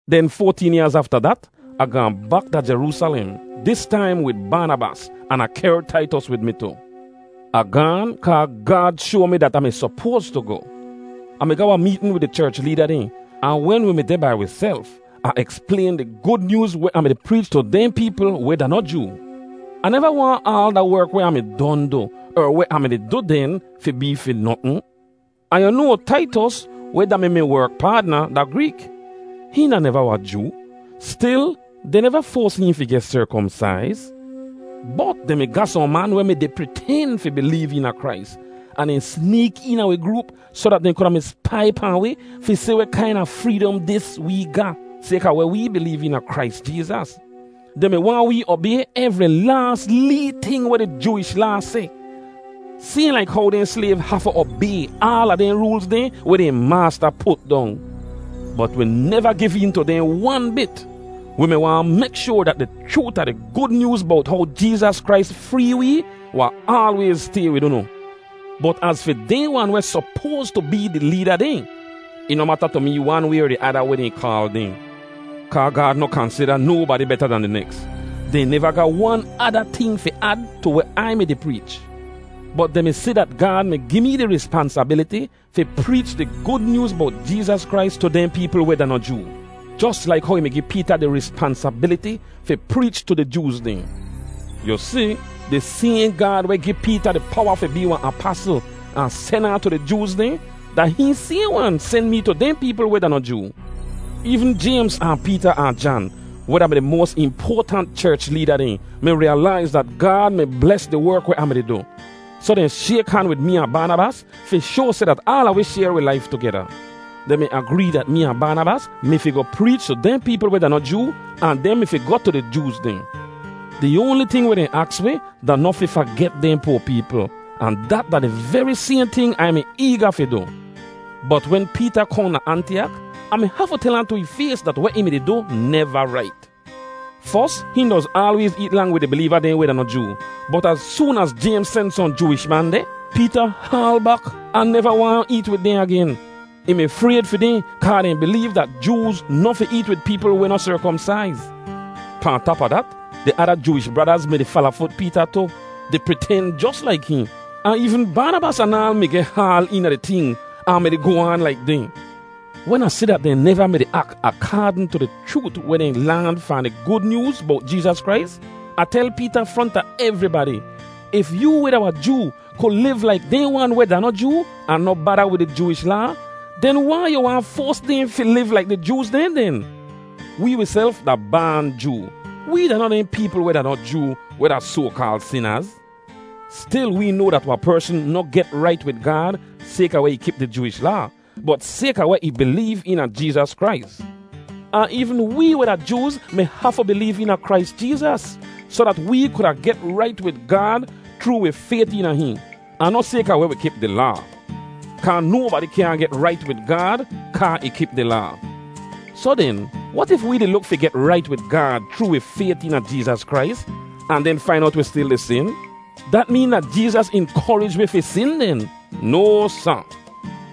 Den foateen yaaz afta dat, Ah gaahn bak da Jeroosalem, dis taim wid Baanabas, an Ah kehr Taitos wid mi tu. Ah gaan, kaa Gaad shoa mi dat Ah mi sopoas tu goh. Ah mi ga wahn meetn wid di cherch leeda dehn, ahn wen wi mi deh bai wiself, Ah eksplayn di Gud Nyooz weh Ah mi-di preech tu dehn peepl weh da noh Joo. Ah neva waahn aal da werk weh Ah mi don du, er weh Ah mi-di du den, fi bee fi notn. Ahn yu noa, Taitos, weh da-mi mi werk paadna, da Greek; hihn da neva wahn Joo; stil dehn neva foas hihn fi geh serkomsaiz. Bot dehn mi ga sohn man weh mi-di priten fi bileev eena Krais, ahn dehn sneek eena wi groop soh dat dehn kuda spai pahn wi fi si weh kaina freedom dis wee ga sayka weh wee bileev eena Krais Jeezas. Dehn mi waahn wee obay evri laas lee ting weh di Jooish Laa seh, sayhn laik how dehn slayv hafu obay aala dehn roolz dehn weh dehn maasta put dong. Bot wi neva giv een tu dehn wan bit. Wi mi waahn mek shoar dat di chroot a di Gud Nyooz bowt how Jeezas Krais free wee wahn aalwayz stay wid unu. Bot az fi dehn wan weh sopoas tu bee di leeda dehn (ih noh mata tu mee wan way er di ada weh dehn kaal dehn, kaa Gaad noh kansida nobadi beta dan di neks), dehn neva ga wan ada ting fi ad tu weh Ai mi-di preech. Bot dehn mi si dat Gaad mi gi mee di rispansabiliti fi preech di Gud Nyooz bowt Jeezas Krais tu dehn peepl weh da noh Joo, jos laik how ih mi gi Peeta di rispansabiliti fi preech tu di Jooz dehn. Yu si, di sayhn Gaad weh gi Peeta di powa fi bee wahn apasl ahn sen ahn tu di Jooz dehn, da hihn sayhn wan sen mee tu dehn peepl weh da noh Joo. Eevn Jaymz ahn Peeta ahn Jan, weh da-mi di moas impoatant cherch leeda dehn, mi riyalaiz dat Gaad mi bles di werk weh Ah mi-di du; soh dehn shayk han wid mee ahn Baanabas fi shoa seh dat aala wi shayr wi laif tugeda. Dehn mi agree dat mee ahn Baanabas mi fi goh preech tu dehn peepl weh da noh Joo, ahn dehn mi fi goh tu di Jooz dehn. Di oanli ting weh dehn aks wi da noh fi faget dehn poa peepl, ahn dat da di veri sayhn ting Ai mi eega fi du. Bot wen Peeta kohn da Antiyak, Ah mi hafu tel ahn tu ih fays dat weh ih mi-di du neva rait. Fos, hihn doz aalwayz eet lang wid di bileeva dehn weh da noh Joo, bot az soon az Jaymz sen sohn Jooish man deh, Peeta haal bak ahn neva waahn eet wid dehn agen. Ih mi frayd fi dehn kaa dehn bileev dat Jooz noh fi eet wid peepl weh noh serkomsaiz. Pahn tap a dat, di ada Jooish bradaz mi-di falafut Peeta tu, di priten jos laik hihn; ahn eevn Baanabas anaal mi geh haal eena di ting ahn mi-di goh aan laik dehn. Wen Ah si dat dehn neva mi-di ak akaadn tu di chroot weh dehn laan fahn di Gud Nyooz bowt Jeezas Krais, Ah tel Peeta fronta evribadi, “If yoo weh da wahn Joo ku liv laik dehn wan weh da noh Joo ahn noh bada wid di Jooish Laa, den wai yu waahn foas dehn fi liv laik di Jooz dehn den? “Wee wiself da baan Joo; wee da noh dehn peepl weh da noh Joo weh da soa-kaal ‘sinaz.’ Stil wee noa dat wahn persn noh get rait wid Gaad sayka weh ih kip di Jooish Laa, bot sayka weh ih bileev eena Jeezas Krais. Ahn eevn wee weh da Jooz mi hafu bileev eena Krais Jeezas soh dat wee kuda get rait wid Gaad chroo wi fayt eena hihn, ahn noh sayka weh wi kip di Laa. Kaa nobadi kyaahn get rait wid Gaad kaa ih kip di Laa.” “Soh den, wat if wee di luk fi get rait wid Gaad chroo wi fayt eena Jeezas Krais, ahn den fain owt wi stil di sin? Dat meen dat Jeezas inkorij wi fi sin den? No, sa!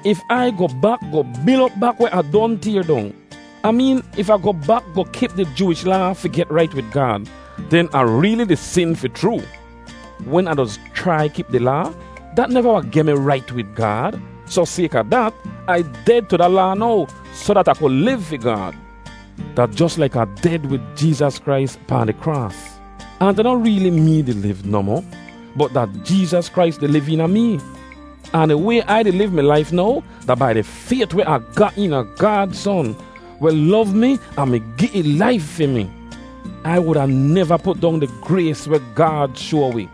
If Ai goh bak goh bil op bak weh Ah don tayr dong—Ah meen if Ah goh bak goh kip di Jooish Laa fi get rait wid Gaad—den Ah reeli di sin fi chroo. Wen Ah doz chrai kip di Laa, dat neva wahn geh mi rait wid Gaad, soh sayka dat, Ai ded tu da Laa now soh dat Ah ku liv fi Gaad. Da jos laik Ah ded wid Jeezas Krais pahn di kraas. Ahn da noh reeli mee di liv nohmoh, bot da Jeezas Krais di liv eena mee. Ahn di way Ai di liv mi laif now da bai di fayt weh Ah ga eena Gaad Son, weh lov mi ahn mi gi ih laif fi mi. Ai wuda neva put dong di grays weh Gaad shoa wi.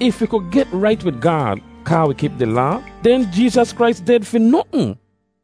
If wi ku get rait wid Gaad kaa wi kip di Laa, den Jeezas Krais ded fi notn.”